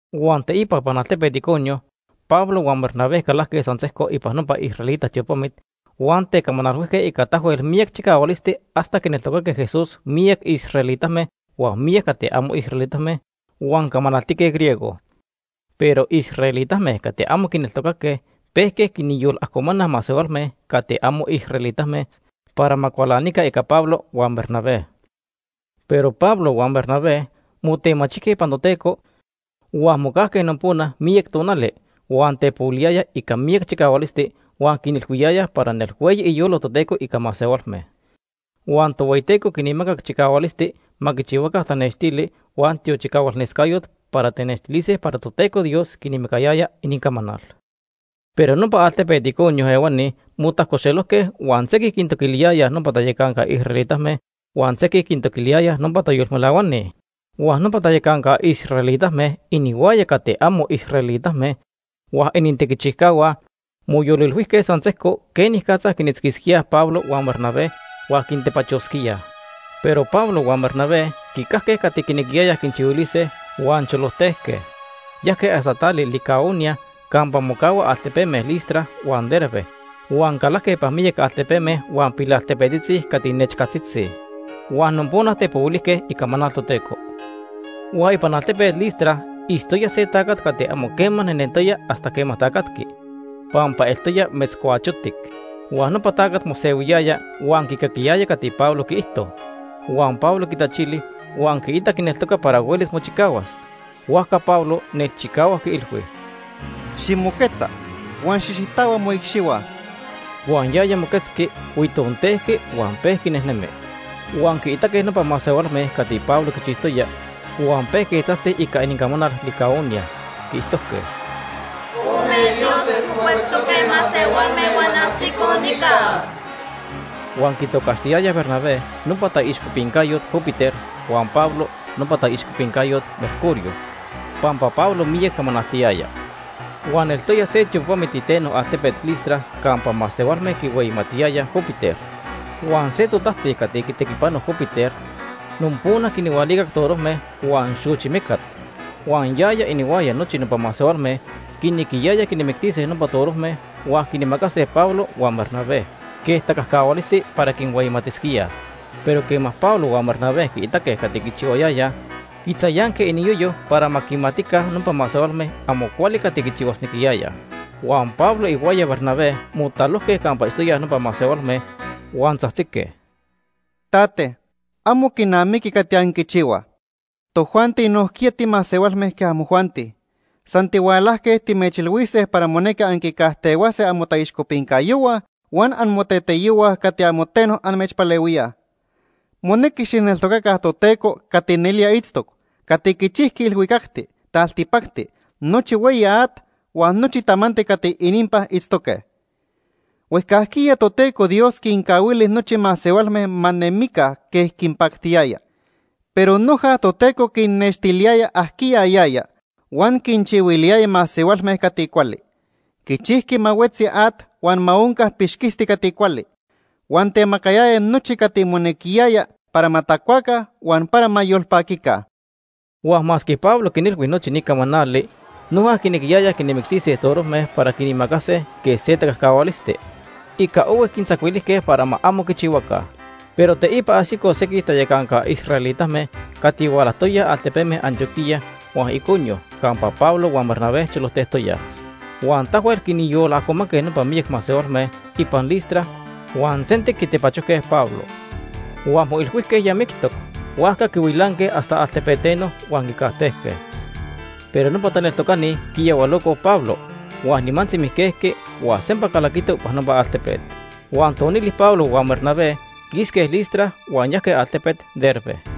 Huan teipa ipan altepet Iconio Pablo huan Bernabé calajque san sejco ipan nopa israelita tiopamit huan tecamanalhuijque ica tahuel miyac chicahualisti hasta quineltocaque Jesús miyac israelitame huan miyac cati amo israelitame huan camanaltique griego. Pero israelitame cati amo quineltocaque pejque quinyolajcomanaj masehualme cati amo israelitame para ma cualanica ica Pablo huan Bernabé. Pero Pablo huan Bernabé motemachijque ipan Toteco, huan mocajque nopona miyac tonali, huan tepohuiliyayaj ica miyac chicahualisti huan quinilhuiyayaj para nelhueyi iyolo Toteco ica masehualme. Huan Tohueyiteco quinmacac chicahualisti ma quichihuaca tanextili huan tiochicahualnescayot para tenextilise para Toteco Dios quinmacayaya inincamanal. Pero nopa altepet Iconio ehuani motajcoxelojque huan sequij quintoquiliyayaj nopa tayacanca israelitame, huan sequinoc quintoquiliyayaj nopa tayolmelahuani. Huan nopa tayacanca israelitame, inihuaya cati amo israelitame huan inintequichijcahua, moyolilhuijque san sejco quenicatza quinitzquisquíaj Pablo huan Bernabé huan quintepachosquíaj. Pero Pablo huan Bernabé quicajque cati quinequiyayaj quinchihuilise huan cholojtejque. Yajque hasta tali Licaonia campa mocahuaj altepeme Listra huan Derbe huan calajque ipan miyac altepeme huan pilaltepetzitzi cati nechcatzitzi. Huan nopona tepohuilijque icamanal Toteco. Huan ipan altepet Listra itztoya se tacat cati amo quema nejnentoya hasta quema tacatqui pampa eltoya metzcuachotic. Huan nopa tacat mosehuiyaya huan quicaquiyaya cati Pablo quiijto. Huan Pablo quitachili huan quiitac quineltoca para huelis mochicahuas. Huajca Pablo nelchicahuac quiilhui: ―Ximoquetza huan xijxitahua moicxihua. Huan yaya moquetzqui, huitontejqui huan pejqui nejnemi. Huan quiitaque nopa masehualme cati Pablo quichijtoya, huan pejque tzajtzij ica inincamanal Licaonia. Quiijtojque: ―Ome dioses mocuectoque masehualme huan ajsicoj nica. Huan quitocaxtiyayaj Bernabé nopa taixcopincayot Júpiter huan Pablo nopa taixcopincayot Mercurio, pampa Pablo miyac camanaltiyaya. Huan eltoya se tiopamit iteno altepet Listra campa masehualme quihueyimatque Júpiter. Huan se totajtzi cati quitequipano Júpiter nopona quinhualicac torojme huan xochi mecat. Huan yaya inihuaya nochi nopa masehualme quinequiyayaj quinmictise nopa torojme, huan quinmacase Pablo huan Bernabé quej tacajcahualisti para quinhueyimatisquíaj. Pero quema Pablo huan Bernabé quiitaque cati quichihuayayaj, quitzayanque iniyoyo para ma quimatica nopa masehualme amo cuali cati quichihuasnequiyayaj. Huan Pablo ihuaya Bernabé motalojque campa itztoyaj nopa masehualme, huan tzajtzique: ―Tates, amo quinamiqui cati anquichihuaj. Tojuanti nojquiya timasehualme quej amojuanti. San tihualajque timechilhuise para monequi anquicajtehuase amotaixcopincayohua huan amoteteyohua cati amo teno amechpalehuíaj. Monequi xijneltocaca Toteco cati nelía itztoc, cati quichijqui ilhuicacti, taltipacti, nochi hueyi at, huan nochi tamanti cati ininpan itztoque. Huejcajquiya Toteco Dios quincahuili nochi masehualme ma nemica quej quinpactiyaya. Pero noja Toteco quinnextiliyaya ajquiya yaya huan quinchihuiliyaya masehualme cati cuali. Quichijqui ma huetzi at huan ma onca pixquisti cati cuali. Huan temacayaya nochi cati monequiyaya para ma tacuaca huan para ma yolpaquica. Huan masque Pablo quinilhui nochi ni camanali, noja quinequiyayaj quinmictise torojme para quinmacase quej se tacajcahualisti. Ica ohui quintzacuilijque para ma amo quichihuaca. Pero teipa ajsicoj sequij tayacanca israelitame cati hualajtoyaj altepeme Antioquía huan Iconio campa Pablo huan Bernabé cholojtejtoyaj. Huan tahuel quinyolajcomanque nopa miyac masehualme ipan Listra huan sentic quitepachojque Pablo. Huan moilhuijque ya mictoc, huajca quihuilanque hasta altepeteno huan quicajtejque. Pero nopa taneltocani quiyahualocoj Pablo, huan nimantzi mijquejqui huan sempa calaquito ipan nopa altepet. Huan tonili, Pablo huan Bernabé quisque Listra huan yajque altepet Derbe.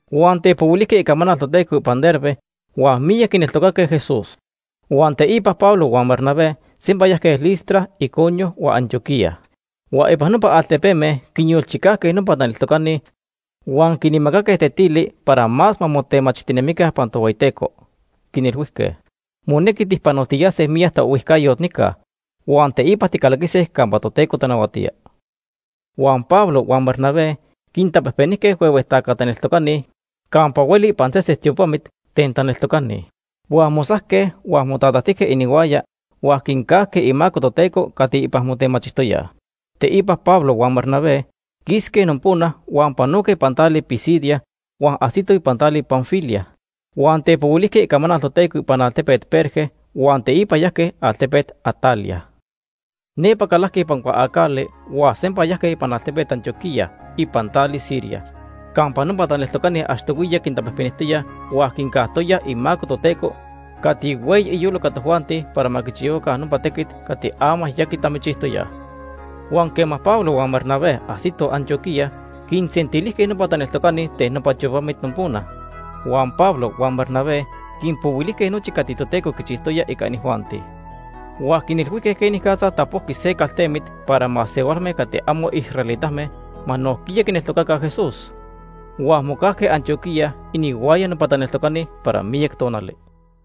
Huan tepohuilijque icamanal Toteco ipan Derbe, huan miyac quineltocaque Jesús. Huan teipa Pablo huan Bernabé sempa yajque Listra, Iconio, huan Antioquía. Huan ipan nopa altepeme quinyolchicajque nopa taneltocani huan quinmacaque tetili para más ma motemachijtinemica ipan Tohueyiteco, quinilhuijque: “Monequi tijpanotiyase miyac taohuijcayot nica, huan teipa ticalaquise campa Toteco tanahuatía.” Huan Pablo huan Bernabé quintapejpenijque huehue taca taneltocani campa hueli ipan sesen tiopamit ten taneltocani. Huan mosajque, huan motatajtijque inihuaya huan quincajque imaco Toteco cati ipan motemachijtoyaj. Teipa Pablo huan Bernabé quisque nopona huan panoque ipan tali Pisidia huan ajsitoj tali Panfilia. Huan tepohuilijque icamanal Toteco ipan altepet Perge huan teipa yajque altepet Atalia. Nepa calajque ipan cuaacali huan sempa yajque ipan altepet Antioquía ipan tali Siria campa nopa taneltocani achtohuiya quintapejpenijtoyaj huan quincajtoyaj imaco Toteco cati hueyi iyolo ica tojuanti para ma quichihuaca nopa tequit cati ama ya quitamichijtoyaj. Huan quema Pablo huan Bernabé ajsitoj Antioquía, quinsentilijque nopa taneltoca ten nopa tiopamit nopona. Huan Pablo huan Bernabé quinpohuilijque nochi cati Toteco quichijtoya ica inijuanti. Huan quinilhuijque quenicatza tapojqui se caltemit para masehualme cati amo israelitame ma nojquiya quineltocaca Jesús. Huan mocajque Antioquía inihuaya nopa taneltocani para miyac tonali.